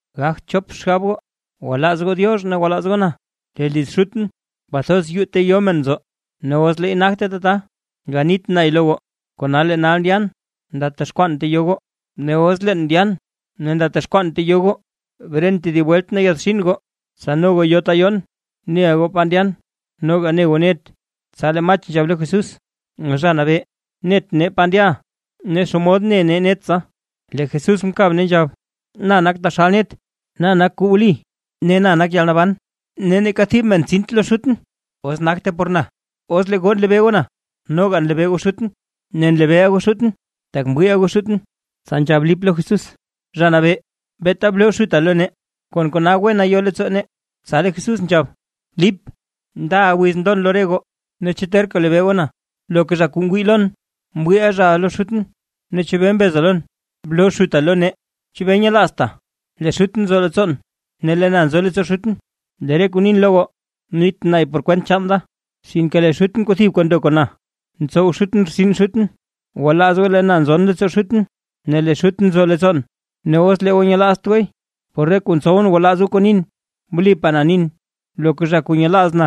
’Gagt chop xgab goo, gwalaaz goo Diox ne gwalaaz goo na. Lee liz Xutʼn kwathoz yuu ta yo men nzo; ne os leey nagte tata, ganit nay lo goo. Kona lee nal ndyan ndatexkwaan ta yo goo. Ne os leen ndyan ne ndatexkwaan ta yo goo, bren tedib welt ne yaadxin goo, tsa no goo yo goo ta yoon. Neʼa goo pa ndyan, noga ne goo net. Tsa lee Mach nzhab lo Jesús: ―Zha nabee, net nee pa ndyaʼa, ne ¿xomod ne nee net tsa? Lee Jesús mkab ne nzhab: ―Na nak taxal net, na nak kuu wli, ne na nak yalnaban. Ne neeka thib men tsint lo Xutʼn, os nagte por na. Os lee goo nlebee goo na, noga nlebee goo Xutʼn; ne nlebeeʼa goo Xutʼn, tak mwiiʼa goo Xutʼn. Tsa nzhab Lip lo Jesús: ―Zha nabee, beeta bloo Xuta lo nee, ne kon kona wena yo leettsoo nee. Tsa lee Jesús nzhab: ―Lip, ndaʼa wiz ndon lo re goo, ne ¿chu terka lebeeʼa na? Loka zha kuu ngwii lon, mwiiʼa zhaʼa lo Xutʼn; ne ¿chebee mbeza lon “bloo Xuta lo nee”? ¿Chebee nyelaazta lee Xutʼn nzo leettsoon ne lee na nzon leettsoo Xutʼn? Lee re kuu nin lo goo, nit nay por kwent chaan da, sinke lee Xutʼn kuu thibka ndo kon na, ntsow Xutʼn rtsin Xutʼn. Gwalaaz goo lee na nzon leettsoo Xutʼn, ne lee Xutʼn nzo leettsoon. Ne os lee goo nyelaazt gooy, por re kuu ntsowʼn gwalaaz goo kuu nin. Wlipaa na nin, loka zha kuu nyelaaz na,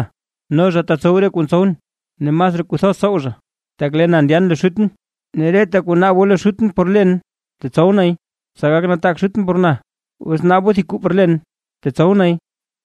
no zha tetsow zha re kuu ntsowʼn, ne masraa kuu thoz tsow zha, tak lee na ndyan lo Xutʼn. Ne reta kuu naab goo lo Xutʼn por len, tetsow nay, tsa gak nataak Xutʼn por na. Os naab goo thib kuu por len, tetsow nay.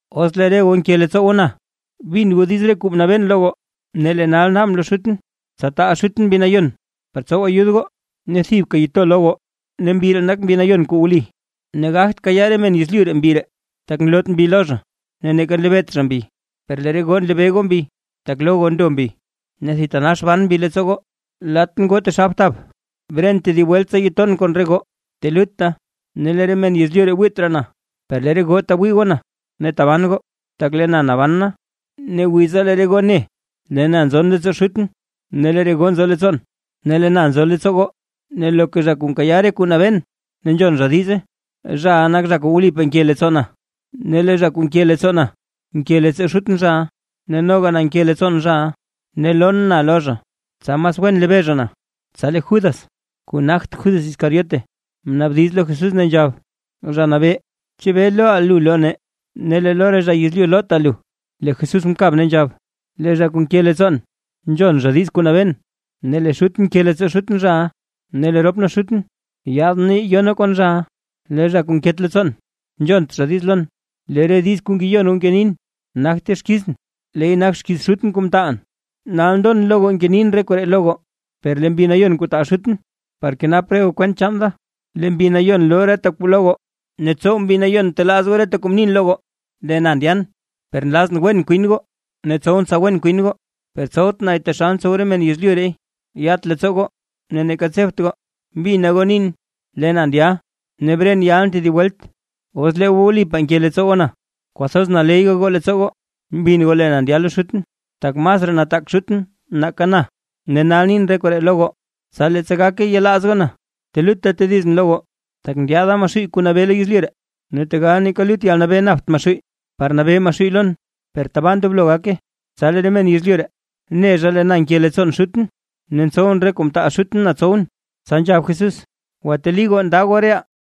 ’Os lee re goo nke leettsoo goo na, bin goo diiz re kuu mnabeen lo goo. Ne lee na nal naabʼn lo Xutʼn, tsa taal Xutʼn Mbi Nayon, par tsow ayud goo ne thibka to lo goo, ne Mbi ree nak Mbi Nayon kuu wli ne gagt kayaa re men yezlyu Mbi ree, tak nloot Mbi lo zha ne neeka nlebeet zha Mbi, per lee re goo nlebee goo Mbi, tak lo goo ndo Mbi, ne thitanax ban Mbi leettsoo goo. ’Latʼn goo taxal btab, bren tedib welt tsa ton kon re goo. Telutta ne lee re men yezlyu ree wiit raa na; per lee re goo tewii goo na ne taban goo, tak lee na naban na. Ne wiza lee re goo ne, lee na nzon leettsoo Xutʼn, ne lee re goo nzo leettsoon, ne lee na nzo leettsoo goo. Ne loka zha kuu nkayaa re kuu nabeen ne nzhon zha diize, zhaʼa nak zha kuu wlipaa nke leettsoo na; ne lee zha kuu nke leettsoo na nke leettsoo Xutʼn zhaʼa ne noga na nke leettsoon zhaʼa, ne lon na lo zha, tsa mas wen lebee zha na. Tsa lee Judas (kuu nagt Judas Iscariote), mnaabdiz lo Jesús ne nzhab: ―Zha Nabee, ¿chebee looʼa lu lo nee, ne lee lo re zha yezlyu loota lu? Lee Jesús mkab ne nzhab: ―Lee zha kuu nke leettsoo na nzhon zha diiz kuu nabeen; ne lee Xutʼn nke leettsoo Xutʼn zhaʼa, ne lee rop nee Xutʼn yaad nee yo nee kon zhaʼa. Lee zha kuu nket leettsoo na, nzhont zhaʼa diiz lon. Lee re diiz kuu ngeyon goo ngenin, nagte xkizʼn, leey nak xkiiz Xutʼn kuu mtaalʼn. ’Nal ndon lo goo ngenin re koree lo goo, per lee Mbi Nayon kuu taal Xutʼn par kenap re goo kwent chaan da, lee Mbi loo reta kuu lo goo, ne tsow Mbi telaaz goo reta kuu mnin lo goo. ’Lee na ndyan, per nlazʼn wen kwin goo, ne tsowʼn tsa wen kwin goo, per tsowt nay taxal ntsow re men yezlyu reey. Yat leettsoo goo ne neeka tsebt goo. Mbina goo nin, lee na ndya ne bren yalʼn tedib welt. Os lee goo wlipaa nke leettsoo goo na, kwathoz naley gayoo leettsoo goo mbin goo lee na ndya lo Xutʼn, tak masraa nataak Xutʼn nake na. Ne nal nin re koree lo goo, tsa leettsa gake yelaaz goo na. ’Telutta tedizʼn lo goo, tak ndyaada Maxuuy kuu nabee lo yezlyu ree. Ne tegal neeka lut yalnabee napt Maxuuy par nabee Maxuuy lon, per tabaa ndoblo gake. Tsa lee re men yezlyu ree ne lee na nke leettsoon Xutʼn, ne ntsowʼn re kuu mtaal Xutʼn na tsowʼn. Tsa nzhab Jesús: ―Gwateli goo nda goo reʼaa.